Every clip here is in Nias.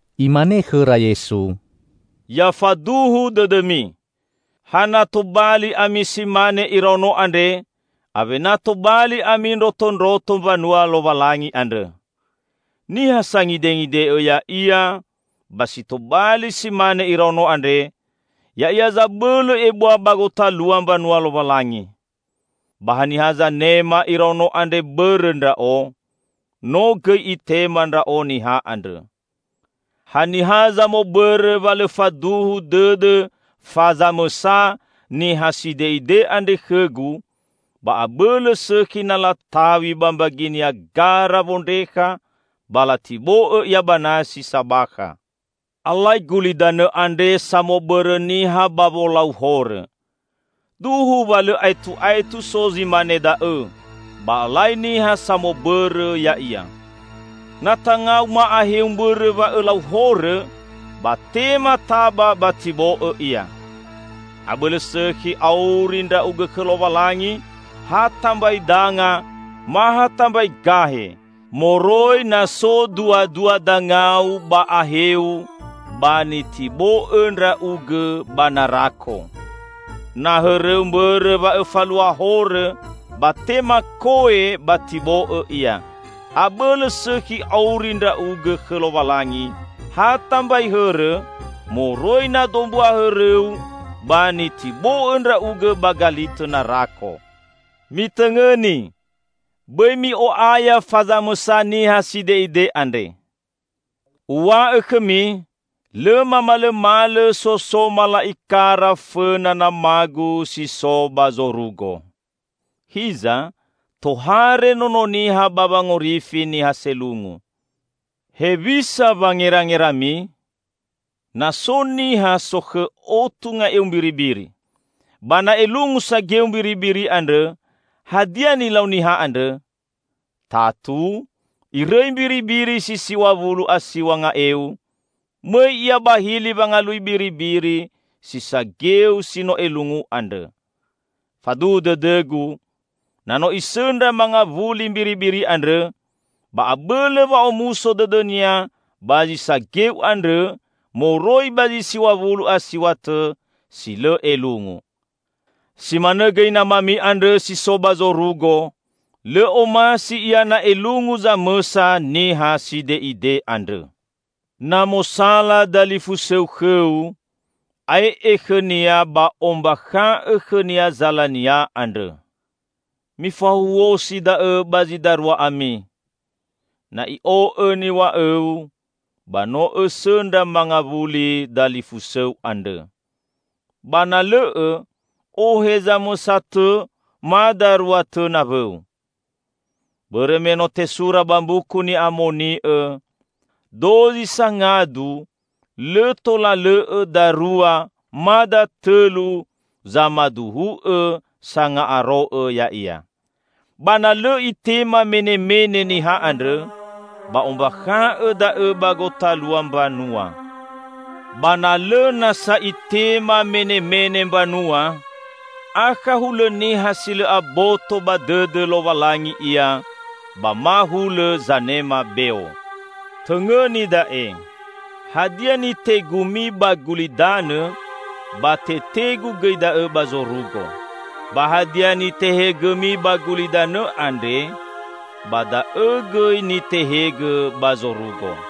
Imane khõra Yesu, "Ya faduhu dõdõmi! Ha na tobali ami si mane iraono andre, awena tobali ami ndrotondroto mbanua Lowalangi andrõ. Niha sangidengide'õ ya'ia ba si tobali si mane iraono andre, ya'ia zabõlõ ebua ba gotalua mbanua Lowalangi. Ba haniha zanema iraono andre bõrõ Ndra'o, no gõi itema Ndra'o niha andrõ." "Haniha zamobõrõ wa lõ faduhu dõdõ fa zamõsa niha side'ide andre khõ-Gu, ba abõlõ sõkhi na lataw̃i ba mbaginia gara wondrekha, ba latibo'õ ia ba nasi sabakha. Alai gulidanõ andre samobõrõ niha ba wolau horõ. Duhu wa lõ aetu'aetu so zi mane da'õ, ba alai niha samobõrõ ya'ia! Na tangau ma aheu mbõrõ wa õlau horõ, ba tema taba ba tibo'õ ia. Abõlõ sõkhi auri ndra'ugõ khõ Lowalangi ha tambai danga ma ha tambai gahe, moroi na so duadua dangau ba aheu, ba nitibo'õ ndra'ugõ ba narako. Na hõrõu mbõrõ wa õfalua horõ, ba tema ko'e ba tibo'õ ia. Abõlõ sõkhi auri ndra'ugõ khõ Lowalangi ha tambai hõrõ, moroi na dombua hõrõu ba nitibo'õ ndra'ugõ ba galitõ narako." "Mitõngõni! Bõi mi'o'aya fa zamõsa niha side'ide andre. Uw̃a'õ khõmi, lõ mamalõmalõ so so mala'ikara fõna Nama-Gu si so ba zorugo. [Hiza, tohare Nono Niha ba wangorifi niha selungu!] Hewisa wangerangerami? Na so niha sokhõ otu nga'eu mbiribiri. Ba na elungu sageu mbiribiri andrõ, hadia nilau niha andrõ? Tatu irõi mbiribiri si siw̃a wulu a siw̃a nga'eu, mõi ia ba hili wangalui biribiri si sageu si no elungu andrõ. Faduhu dõdõ-Gu, na no isõndra mangawuli mbiribiri andrõ, ba abõlõ wa'omuso dõdõnia ba zi sageu andrõ moroi ba zi siw̃a wulu a siw̃a tõ si lõ elungu. Si manõ gõi Namami andrõ si so ba zorugo, lõ omasi Ia na elungu zamõsa niha side'ide andrõ." "Na mosala dalifusõu khõu, ae'e khõnia ba ombakha'õ khõnia zalania andrõ. Mifahuhuosi da'õ ba zi darua ami. Na i'o'õ niw̃a'õu, ba no õsõndra mangawuli dalifusõu andrõ. Ba na lõ'õ, ohe zamõsa tõ ma darua tõ nawõu. Bõrõ me no tesura ba Mbuku Ni'amoni'õ, 'Dozi sangadu, lõ tola lõ'õ darua ma datõlu zamaduhu'õ sanga'aro'õ ya'ia.' Ba na lõ itema menemene niha andrõ, ba ombakha'õ da'õ ba gotalua mbanua. Ba na lõ nasa itema menemene mbanua, akha hulõ niha si lõ aboto ba dõdõ Lowalangi ia ba ma hulõ zanema beo." "Tõngõni da'e: Hadia nitegumi ba gulidanõ, ba tetegu gõi da'õ ba zorugo. Ba hadia nitehegõmi ba gulidanõ andre, ba da'õ gõi nitehegõ ba zorugo.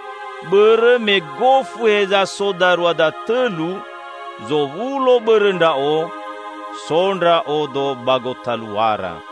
Bõrõ me gofu heza so darua datõlu zowulo bõrõ Ndra'o, so Ndra'odo ba gotaluara."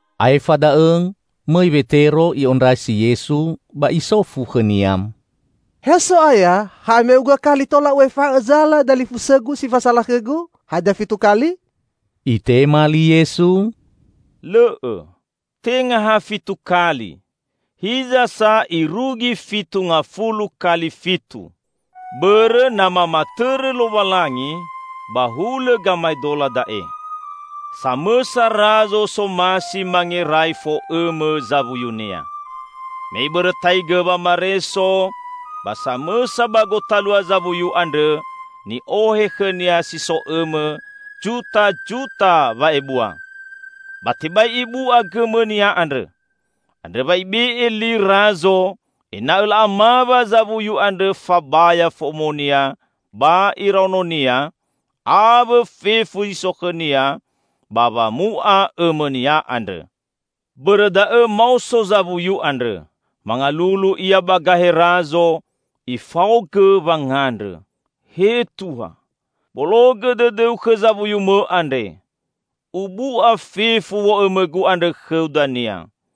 Aefa da'õ, mõi Wetero i'ondrasi Yesu ba isofu khõ-Nia, "He So'aya, hame'uga kali tola u'efa'õ zala dalifusõgu si fasala khõgu? Hadia fitu kali?" Itema li Yesu, "Lõ'õ, tenga ha fitu kali, hiza sa irugi fitu ngafulu kali fitu! Bõrõ na mamatõrõ Lowalangi, ba hulõ gamaedola da'e: Samõsa razo somasi mangerai fo'õmõ zawuyunia. Me ibõrõtaigõ wamareso, ba samõsa ba gotalua zawuyu andrõ ni'ohe khõnia si so õmõ jutajuta wa'ebua, ba tebai ibu'a gõmõnia andrõ. Andrõ wa ibe'e li razo ena'õ la'amawa zawuyu andrõ fabaya fo'omonia ba iraononia, awõ fefu zi so khõnia, ba wamu'a õmõnia andrõ. Bõrõ da'õ maoso zawuyu andrõ, mangalulu ia ba gahe razo, ifaogõ wangandrõ, 'He Tuha, bologõ dõdõu khõ zawuyumõ andre. Ubu'a fefu wo'õmõgu andrõ khõu dania.'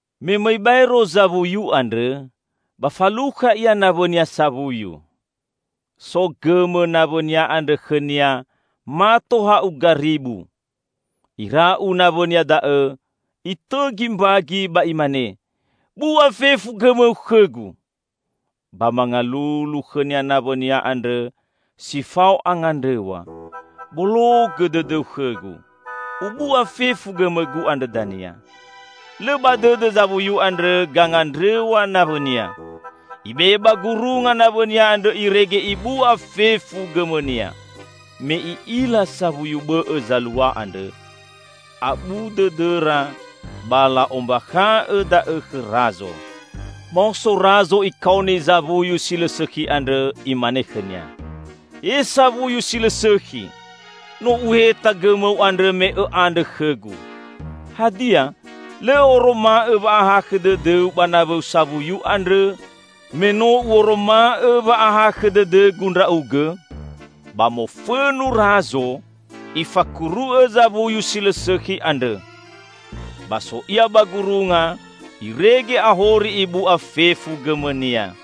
Me mõi baero zawuyu andrõ, ba falukha ia nawõnia sawuyu. So gõmõ nawõnia andrõ khõnia mato ha'uga ribu. Ira'u nawõnia da'õ, itõgi mbagi ba imane, 'Bu'a fefu gõmõu khõgu!' Ba mangalulu khõnia nawõnia andrõ si fao angandrõw̃a, 'Bologõ dõdõu khõgu, ubu'a fefu gõmõgu andrõ dania!' Lõ ba dõdõ zawuyu andrõ gangandrõw̃a nawõnia. Ibe'e ba gurunga nawõnia andrõ irege ibu'a fefu gõmõnia. Me i'ila sawuyu bõ'õ zalua andrõ, abu dõdõra ba la'ombakha'õ da'õ khõ Razo. Maoso Razo ikaoni zawuyu si lõ sõkhi andrõ, imane khõnia, 'He sawuyu si lõ sõkhi! No uheta gõmõu andrõ me õ'andrõ khõgu. Hadia, lõ õ'oroma'õ wa'ahakhõ dõdõu ba nawõu sawuyu andrõ me no u'oroma'õ wa'ahakhõ dõdõgu ndra'ugõ?' Ba mofõnu Razo, ifakuru'õ zawuyu si lõ sõkhi andrõ. Ba so ia ba gurunga irege ahori ibu'a fefu gõmõnia."